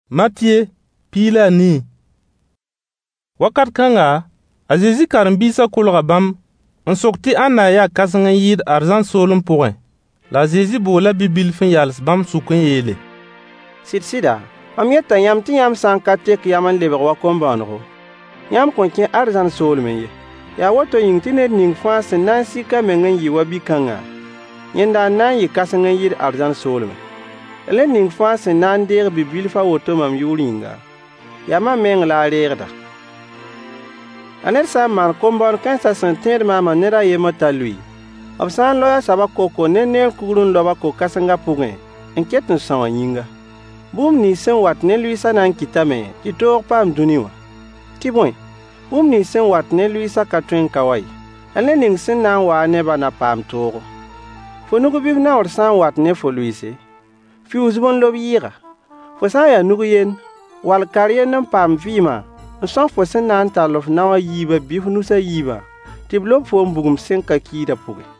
Ãnna n ya kãseng n yɩɩda? Wakat kãnga, a Zezi karen-biisã kolga bãmb n sok tɩ ãnna n ya kãseng n yɩɩd arzãn soolem pʋgẽ? La a Zezi boola bi-bilf n yals bãmb sʋk n yeele: Sɩd-sɩda, mam yeta yãmb tɩ yãmb sã n ka tek yam n lebg wa kom-bõonego, yãmb kõn kẽ arzãn soolmẽ ye. Yaa woto yĩng tɩ ned ning fãa sẽn na n sik a meng n yɩ wa bi-kãngã, yẽnda n na n yɩ kãseng n yɩɩd arzãn soolmẽ. La ned ning fãa sẽn na n deeg bi-bilf a woto mam yʋʋr yĩnga, yaa mam mengã la a reegda. La ned sã n maan kom-bõon-kãensã sẽn tẽed maamã ned a yembr t'a lʋɩ, b sã n loe a soabã kokor ne neer kugr n lob-a ko-kãsengã pʋgẽ n ket n são a yĩnga. Bũmb nins sẽn wat ne lʋɩɩsã na n kɩtame tɩ toog paam dũni wã. Tɩ bõe, bũmb nins sẽn wat ne lʋɩɩsã ka tõe n ka wa ye. La ned ning sẽn na n waa-a ne-bã na paam toogo. Fo nug bɩ f naoor sã n wat ne fo lʋɩɩse, fiuus-b n lob yɩɩga. Fo sã n ya nug-yend wall kar-yend n paam vɩɩmã n são fo sẽn na n tall f nao a yiibã bɩ f nus a yiibã tɩ b lob foom bugum sẽn ka kiidã pʋgẽ.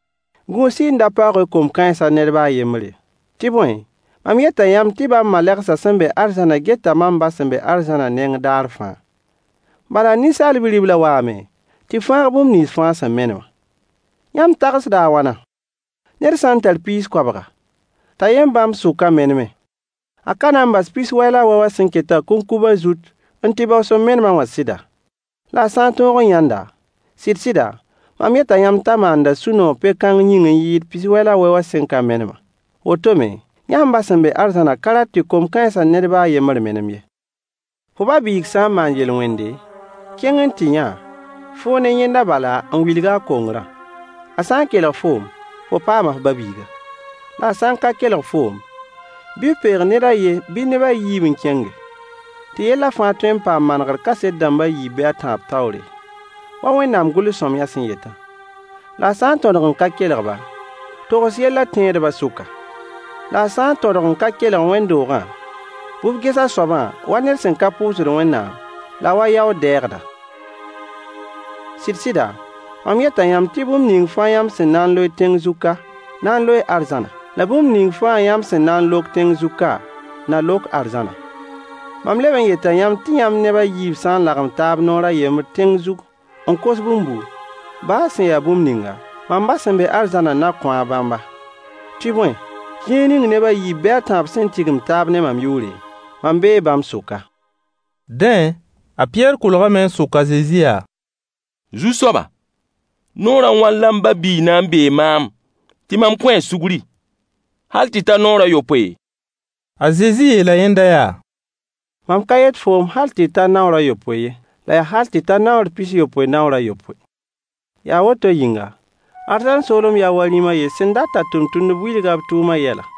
Gũus-y n da paoog-y kom-kãensã ned ba a yembr ye. Tɩ bõe, mam yeta yãmb tɩ bãmb malegsã sẽn be arzãnã geta mam ba sẽn be arzãnã neng daar fãa. [ Bala Ninsaal Bi-riblã waame tɩ fãag bũmb nins fãa sẽn menemã.] Yãmb tagsda a wãna? Ned sã n tar piis koabga, t'a yen bãmb sʋkã meneme, a ka na n bas pis-wɛ la a wɛ wã sẽn ketã kũnkubã zut n tɩ bao sẽn menemã wã sɩda? La a sã n tõog n yãnd-a, sɩd-sɩda, mam yeta yãmb t'a maanda sũ-noog pe-kãng yĩng n yɩɩd pis-wɛ la a wɛ wã sẽn ka menemã. Woto me, yãmb ba sẽn be arzãnã ka rat tɩ kom-kãensã ned ba a yembr menem ye. Fo ba-biig sã n maan yel-wẽnde, kẽng n tɩ yã-a, foo ne yẽnda bala n wilg-a a kongrã. A sã n kelg foom, fo paama f ba-biiga. La a sã n ka kelg foom, bɩ f peeg ned a yen bɩ neb a yiib n kẽnge, “tɩ yellã fãa tõe n paam manegr kaset dãmb a yiib bɩ a tãab taoore,” wa Wẽnnaam gʋls-sõamyã sẽn yetã. La a sã n tõdg n ka kelg-ba, togs yellã tẽedbã sʋka. La a sã n tõdg n ka kelg wẽnd-doogã, bɩ f ges a soabã wa ned sẽn ka pʋʋsd Wẽnnaam la a wa yaood-dɛɛgda. Sɩd-sɩda, mam yeta yãmb tɩ bũmb ning fãa yãmb sẽn na n loe tẽng zug ka na n loee arzãna, la bũmb ning fãa yãmb sẽn na n lok tẽng zug ka na lok arzãna. Mam leb n yeta yãmb tɩ yãmb neb a yiib sã n lagem taab noor a yembr tẽng zug n kos bũmbu, ba sẽn ya bũmb ninga, mam ba sẽn be arzãnã na kõ-a bãmba. Tɩ bõe, zĩig ning neb a yiib bɩ a tãab sẽn tigim taab ne mam yʋʋre, mam bee bãmb sʋka. Dẽ, a Pɩyɛɛr kolgame n sok a Zezi yaa: Zu-soaba! Naoor a wãn la m ba-biig na n beeg maam tɩ mam kõ-a sugri? Hal tɩ ta naoor a yopoe? A Zezi yeela yẽnda yaa: Mam ka yet foom tɩ hal tɩ ta naoor a yopoe ye, la yaa hal tɩ ta naoor pis-yopoe naoor a yopoe. Yaa woto yĩnga, arzãn soolem yaa wa rĩm a yen sẽn dat t'a tʋmtʋmdbã wilg-a b tʋʋmã yɛla.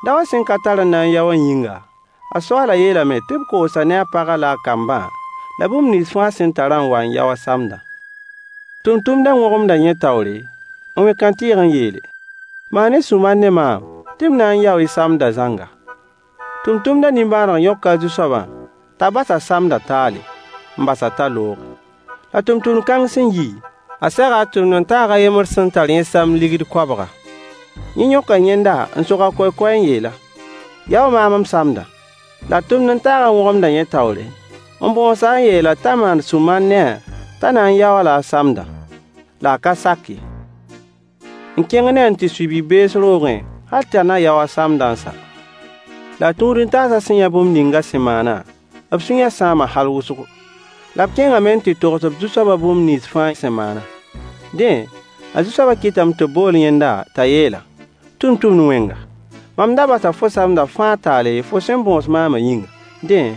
Daowã sẽn ka tar n na n yao wã yĩnga, a soaalã yeelame tɩ b koos-a ne a pagã la a kambã, la bũmb nins fãa a sẽn tarã n wa n yao a sãmdã. Tʋmtʋmdã wõgemda yẽ taoore, n wẽ kãntɩɩg n yeele: “Maan-y sũ-mar ne maam tɩ m na n yaoo y samdã zãnga.” Tʋmtʋmdã nimbãaneg yõka a zu-soabã t'a bas a samdã taale, n bas-a t'a looge. La tʋmtʋmd kãng sẽn yi, a sega a tʋmd-n-taag a yembr sẽn tar yẽ samd deniye koabga. Yẽ yõka yẽnda n sog a kokoɛy n yeel-a: “Yao maam m samdã.” La a tʋmd-n-taagã wõgemda yẽ taoor n bõos-a n yeel-a t'a maan sũ-mar ne-a t'a na n yao-a-la a sãmdã. La a ka sak ye, n kẽng ne-a n tɩ sui bi-bees roogẽ hal t'a na yao a samdã n sa. La a tũud-n-taasã sẽn yã bũmb ning a sẽn maanã, b sũyã sãama hal wʋsgo, la b kẽngame n tɩ togs b zu-soabã bũmb nins fãa sẽn maanã. Dẽ, a zu-soabã kɩtame tɩ b bool yẽnda t'a yeel-a: Tʋmtʋmd-wẽnga! Mam da basa fo samdã fãa taale fo sẽn bõos maamã yĩnga. Dẽ,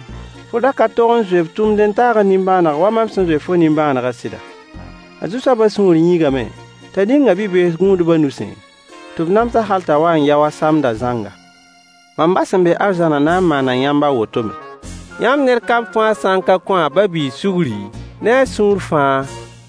fo da ka tog n zoe f tʋmd-n-taagã nimbãaneg wa mam sẽn zoe fo nimbãanegã sɩda? A zu-soabã sũur yĩigame t'a ning-a bi-bees gũudbã nusẽ tɩ b nams-a hal t'a wa n yao a samdã zãnga. Mam ba sẽn be arzãnã na n maana yãmb a woto me, yãmb ned kam fãa sã n ka kõ a ba-biig sugri ne a sũur fãa.